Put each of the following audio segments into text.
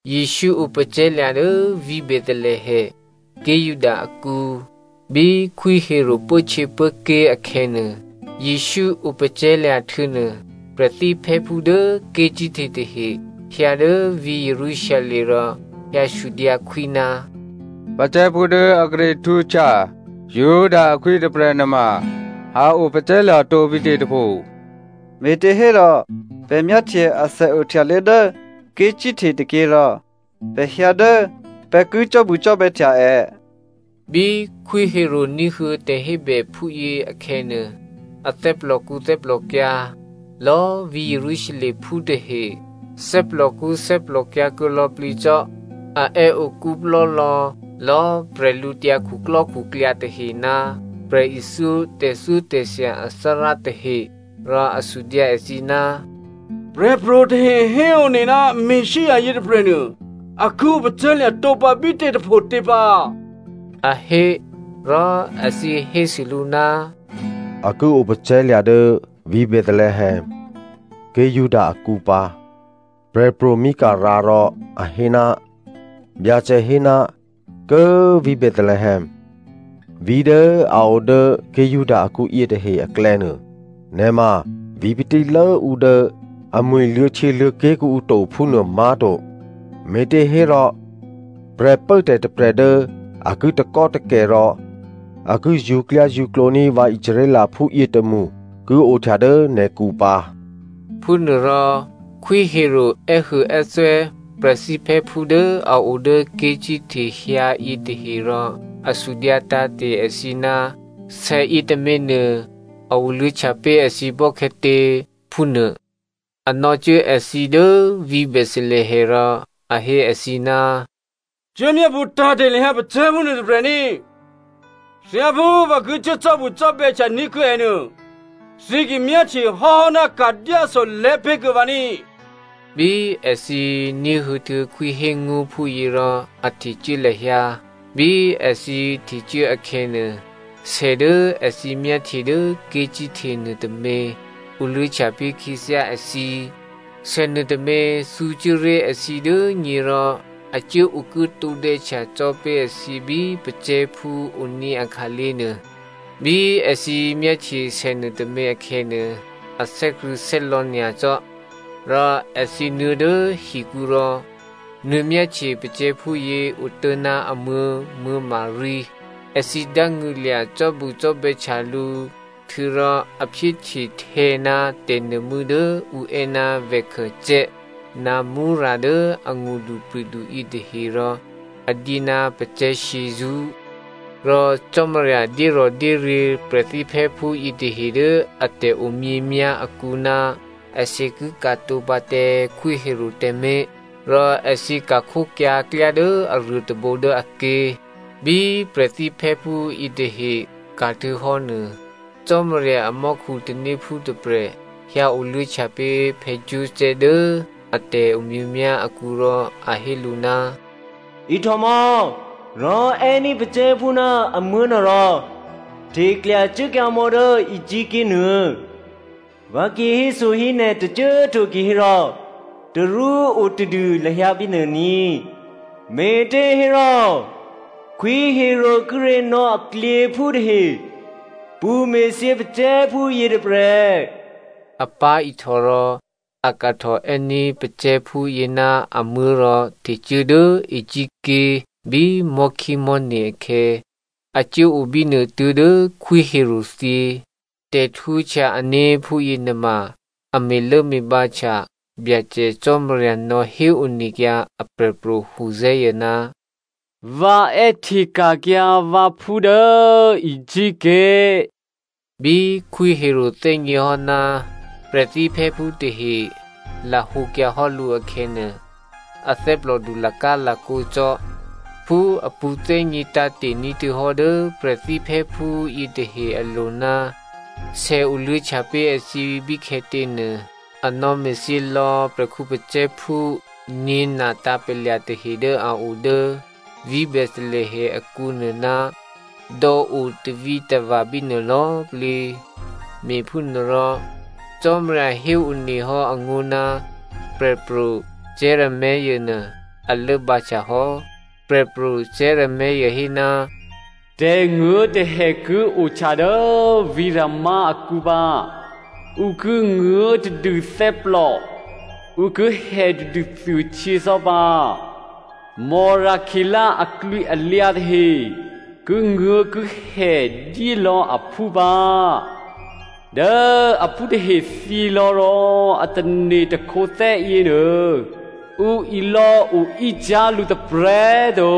Jesǔ opacè̤̌lya̤ dố vǐ̤ Bethelehem, ké̤ Juda akǔ, bí Khwí Herodè pốhtyěpốké̤ akhè̌nuô. Jesǔ opacè̤̌lya̤ htuô̌nuô prè̤thíphè́phú dố ké̤cíhte tahe hyǎ dố vǐ̤ Jerusalem rò hyǎsudyǎ khwí, “Pacè̤̌phú dố a kíré̤ htwǒhtya Juda akhwí yětôprè̤ nuôma a opacè̤̌lya̤ tǒbítě tôpho? Me̤těhérò pè̤ myáhtye asè ohtyaluô̌ dố ké̤cíhte tôkyě rò pè̤ hyǎ dố pè̤ ki cò́bucò́bè̌htya è.” Bí Khwí Herodè ní̤huô̌ tè̤hébè phúyě akhè̌nuô, a thè́plòkṳ́ thè́plòkyǎ̤. Lò̌꤮ vǐ̤ Jerusalemphú tahe thè́plòkṳ́ thè́plòkyǎ̤ kuô̌ lò̌plǐ cò́. A è́ okú plò́lò̌ lò̌꤮ bwídukhu tahe ná prè̤ithyó tè̤thyótè̤thya athárá tahe. Rò a sudyǎ èthǐ, “Prè̤pro̤ tahe héone ná Messia yětôprè̤nuô a ki opacè̤̌lya̤ tǒpǎ bítě tôphotě pǎ,” a hé. Rò èthǐ hésû lǔ, “A ki opacè̤̌lya̤ dố vǐ̤ Bethelehem, ké̤ Juda akǔ pǎ, prè̤pro̤ Mica rǎ rò a hé, Byacè hé, ‘Kố꤮ vǐ̤ Bethelehem꤮, vǐ̤ dố a odố ké̤ Juda akǔ yětahe aklè̌nuô, nè̤ ma vǐ̤ patílốǔ dố amwi̤ luô̌htyěluô̌ké̤ kuô̌ǔ to phúnuô má̤to. Me̤těhérò prè̤pốtè̤ tôprè̤ dố a ki takò́takè̤ rò a ki zṳ̌klyázṳ̌klǒní̤ vǎ Israelphú yětômṳ ki ohtya dố nè̤kǔ pǎ.’” Phúnuôrò Khwí Herodè è́huôè́thwè́ prè̤thíphè́phú dố a o dố ké̤cíhte hyǎ yětahe rò a sudyǎ tǎ̤te̤ èthǐ ná sè yětôměnuô a oluô̌htya pé̤ èthǐ bò́khè̌tě phúnuô. A nò̌cuố èthǐ dố vǐ̤ Bethelehem rò a hé èthǐ, “Cuốmyápṳ̌ tǎ̤te̤ lahyǎ pacè̤̌phú nuôtôprè̤ ní꤮. Thyáphú vǎ ki cuố cò́bucò́bè̌htya ní̤kuô̌ è nuô, thǐ ki myáhtye hò́hò́ ná ka̤dyáso lè̤́pé̤ kuô̌ vǎ ní꤮.” Bí èthǐ ní̤huô̌htuô̌ khwí hé ngó̤ phúyě rò a htecuố lahyǎ. Bí èthǐ htecuố akhè̌nuô, sè dố èthǐ myáhtye dố ké̤cíhte nuôtômě oluô̌htya pé̤ khyěthyá èthǐ. Sè nuôtômě thǔcuố ré̤ èthǐ dố nyě rò a cuố okuố tǒdè̌htya cò́ pé̤ èthǐ bí pacè̤̌phú oní̤ akhǎlé̤ nuô. Bí èthǐ myáhtye sènuôtômě akhè̌nuô, a thè́krṳ̂̌thè́lò̌ nyacò́. Rò èthǐ nuô̌ dố hikǔ rò nuô̌myáhtye pacè̤̌phúyě otố̤ná amuố̤ Maria. Èthǐ dángṳ̂lya̤ cò́bucò́bè̌htya lǔ. Htuô̌rò a phyéhte htè̌ ná tè̤nuô̤mû́ dố ǔ è́ ná lòban ná myrra dố angṳdupri̤du yětahe rò a dyé ná pacè̤̌ shyězṳ́. Rò Cò́marya dyérò̤dyéryě̤ prè̤thíphè́phú yětahe dố a tè̤omyěmyá̤ akǔ ná èthǐ ki ka̤tǒ pǎ tǎ Khwí Herodè tǎmé̤. Rò èthǐ ka̤khókyǎ klyá dố aruô tôbǒ dố aké̤. Bí prè̤thíphè́phú yětahe ka̤htuô̌hò́ nuô, Cò́marya amò́khu tanéphú tôprè̤ hyǎoluô̌htya pé̤ Joseph dố a tè̤omyěmyá̤ akǔ rò a hé lǔ, “Ihtòmò̌! Rò è́ní̤ pacè̤̌phú ná amuố̤nuô rò hteklyacuốkyǎ mò̌ dố Egypt ké̤ nuô. Vǎ ki héso hí nè̤ tôcô꤮ to kihérò tarú otadû lahyǎ bínuô ní꤮, me̤těhérò Khwí Herodè kíré̤ nò̌ aklyěphú tahe pṳ̌me̤thyě pacè̤̌phú yětôprè̤.” A pá̤ihtò rò a kahtò è́ní̤ pacè̤̌phúyě ná amuố̤ rò htecuố dố Egypt ké̤ bí mò̤́khímò̤́ne̤ akhè̌. A cuốo bínuô tuố̤dố Khwí Herodè thyě. Tè̤htwǒhtya ané̤ phúyěnuôma a me̤lốme̤bǎhtya Byacè Cò́marya nò̌ héonekyǎ aprè̤pro̤ Hosea, “Vǎ è́hteka̤kyǎ vǎphú dố Egypt ké̤.” Bí Khwí Herodè thè́gněhò́ ná prè̤thíphè́phú tahe lahǒkyǎ hò́ lǔ akhè̌nuô, a thè́plòdu lakálakǒ cò́. Phú a pṳ̌thè́gně tǎ̤te̤ ní̤htuô̌hò́ dố prè̤thíphè́phú yětahe alo̤ ná sè oluô̌htya pé̤ èthǐ bíkhè̌tě nuô, a nò̌me̤thyě lò̌ prè̤khǔ pacè̤̌phú nyě̤na tǎ̤palya̤ tahe dố a o dố vǐ̤ Bethelehem akǔnuô ná dò̌o tavǐtava̤ bínuô lò̌꤮ plǐ. Me̤phúnuôrò, Cò́marya héone hò́ angó̤ ná Prè̤pro̤ Jeremia nuô a lốbǎ htyahò́. Prè̤pro̤ Jeremia hé, “Tè̤nguố̤tè̤hè ki ohtya dố vǐ̤ Rama akǔ pǎ. Ǔ ki nguố̤tadû thè́plò, ǔ ki hètadû thuôhtyě cò́ pǎ. Rakělè aklwǐalyǎ tahe kinguố̤kihè dyélò̌ aphú pǎ. Dố aphú tahe thyělò̌ rò a tane̤ takhǒthè́ yěnuô, ǔ ilò̌ oícyá̤ lǔ tôprè̤꤮ to.”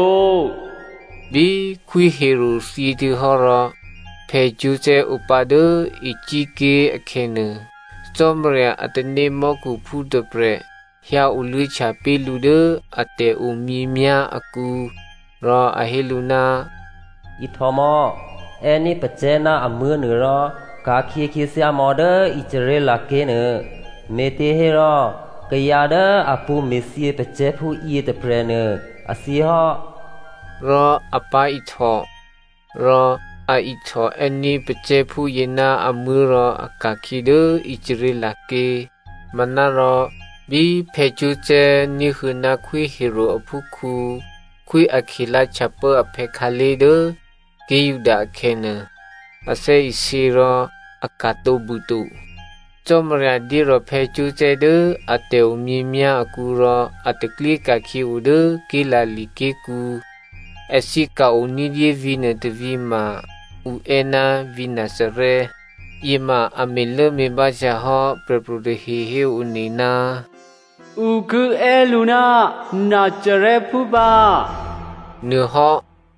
Bí Khwí Herodè thyěhtuô̌hò́ rò Joseph opǎ dố Egypt ké̤ akhè̌ nuô, Cò́marya a tanémò́khuphú tôprè̤ hyǎoluô̌htya pé̤ lǔ dố a tè̤omyěmyá̤ akǔ. Rò a hé lǔ, “Ihtòmò̌! È́ní̤ pacè̤̌ ná amuố̤nuô rò ka̤khyě khyěthyámò̌ dố Israel ké̤nuô, me̤těhérò kayǎ dố a pṳ̌me̤thyě pacè̤̌phú yětôprè̤nuô, a thyěhò́.” Rò a pá̤ihtò, rò a ihtòè́ní̤ pacè̤̌phúyě ná amuố̤ rò a ka̤khyě dố Israel ké̤. Manárò bí Joseph ní̤huô̌ ná Khwí Herodè aphúkhǔ Khwí Arkelao htyapố aphè̌ khǎlé̤ dố ké̤ Juda akhè̌nuô, a thè́isě rò a ka̤tǒ bûto. Cò́marya dyérò̤ Joseph dố a tè̤omyěmyá̤ akǔ rò a taklyé ka̤khyě odố Galilea ké̤kǔ. Èthǐ ka̤-o ní̤dyé vǐ̤nuô tôvǐ̤ ma ǔ è́ ná vǐ̤ Nazarè. Yěma a me̤lốme̤bǎhtya hò́ prè̤pro̤ tahe héone, “Ǔ ki è́ lǔ ná Nazarèphú pǎ,” nuôhò́.